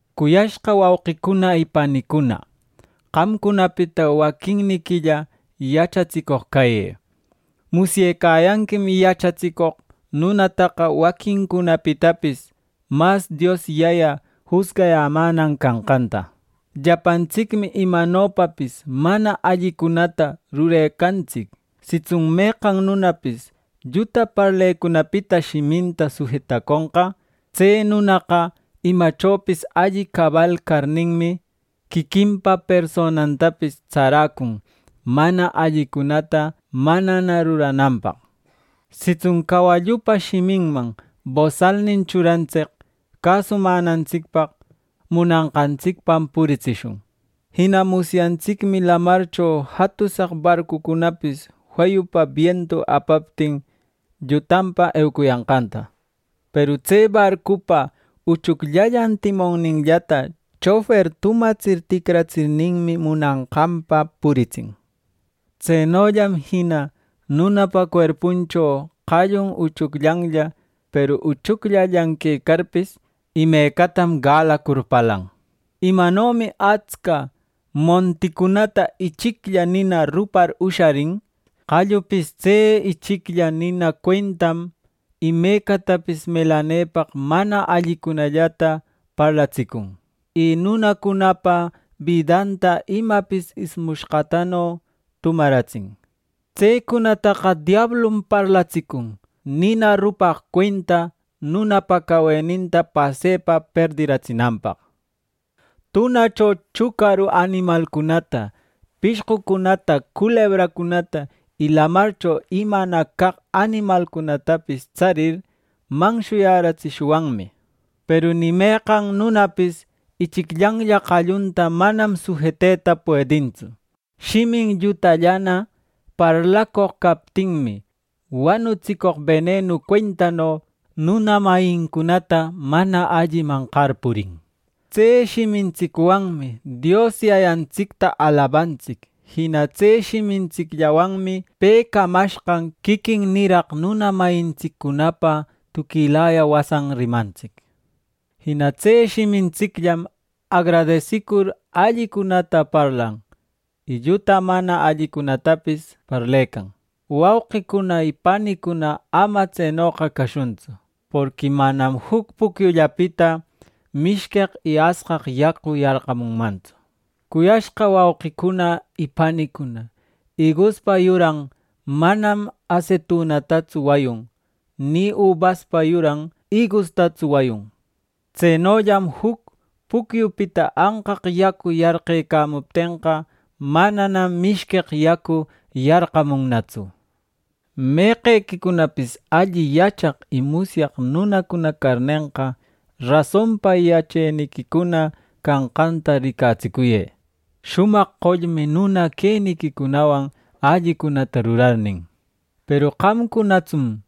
Cuyashqa wauqicuna y panicuna, qamcunapita waquinniquilla yachatsicoq cayë. Musyecayanquim yachatsicoq nunataqa waquincunapitapis mas Dios Yaya jusgayämänan canqanta. Llapantsicmi imanopapis mana allicunata rurecantsic. Sitsun meqan nunapis lluta parlecunapita shiminta sujetaconqa, tse nunaqa imachopis alli cabal carninmi, quiquinpa personantapis tsaräcun mana allicunata manana rurananpaq. Sitsun cawallupa shiminman bosalnin churantsic cäsumänantsicpaq, munanqantsicpam puritsishun. Jina musyantsicmi lamarcho jatusaq barcucunapis feyupa bientu apaptin, llutanpa eucuyanqanta. Peru tse barcupa uchucllallan timonninllata chofer tumatsir ticratsirninmi, munanqanpa puritsin. Tsenollam jina nunapa cuerpuncho qallun uchucllanlla; peru uchucllallan quecarpis, imecatam galacur parlan. Imanomi atsca monticunata ichiclla nina rupar usharin, qallupis tse ichiclla nina cuentam imecatapis melanepaq mana allicunallata parlatsicun; y nunacunapa bidanta imapis ismushqatano tumaratsin. Tsecunataqa diablum parlatsicun, nina rupaq cuenta nunapa caweninta pasepa perdiratsinanpaq. Tunacho chucaru animalcunata, pishqucunata, culebracunata y lamarcho imana caq animalcunatapis tsarir, manshuyätsishwanmi. Peru ni meqan nunapis ichicllanlla qallunta manam sujeteta puedintsu. Shimin llutallana parlacoq captinmi, wanutsicoq benenu cuentano nuna mayincunata mana alliman qarpurin. Tse shimintsicwanmi Dios Yayantsicta alabantsic. Jina tse shimintsicllawanmi pe camashqan quiquin niraq nuna mayintsiccunapa tuquilaya wasan rimantsic. Jina tse shimintsicllam agradesicur allicunata parlan, y lluta mana allicunatapis parlecan. Wauqicuna y panicuna, ama tsenoqa cashuntsu; porqui manam juc pucyullapita mishqueq y asqaq yacu yarqamunmantsu. Cuyashqa wauqicuna y panicuna, iguspa yuran manam asetunastatsu wayun; ni ubaspa yuran igustatsu wayun. Tsenollam juc pucyupita anqaq yacu yarqecamuptenqa; mananam mishqueq yacu yarqamunnatsu. Meqequicunapis alli yachaq y musyaq nunacuna carnenqa, rasonpa yacheniquicuna canqanta ricatsicuyë, shumaq qollmi nuna queniquicunawan allicunata rurarnin. Peru qamcunatsun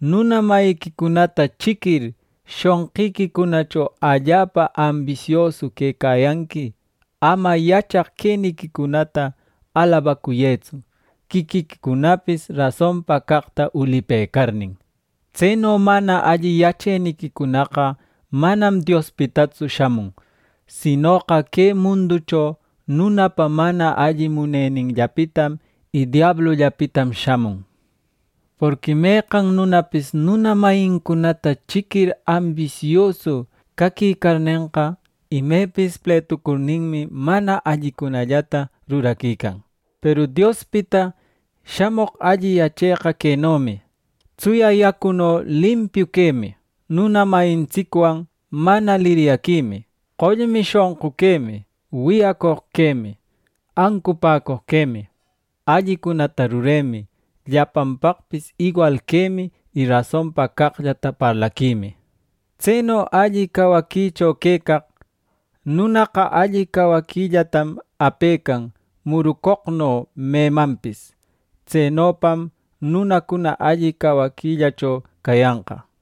nuna mayiquicunata chiquir, shonqiquicunacho allapa ambisiosu quecayanqui; ama yachaq queniquicunata alabacuyëtsu, quiquiquicunapis rasonpa caqta ulipëcarnin. Tseno mana alli yacheniquicunaqa manam Diospitatsu shamun; sinoqa que munducho nunapa mana alli muneninllapitam y diablullapitam shamun. Porqui meqan nunapis nuna mayincunata chiquir ambisiosu caquicarnenqa, imepis pletucurninmi mana allicunallata ruraquican. Peru Diospita shamoq alli yacheqa quenomi: tsuya yacuno limpiu quemi, nuna mayintsicwan mana liryaquimi, qollmi shonqu quemi, wiyacoq quemi, ancupäcoq quemi, allicunata ruremi, llapanpaqpis iwal quemi y rasonpa caqllata parlaquimi. Tseno alli cawaquicho quecaq nunaqa alli cawaquillatam apecan murucoqno memanpis. Tsenopam nunacuna alli cawaquillacho cayanqa.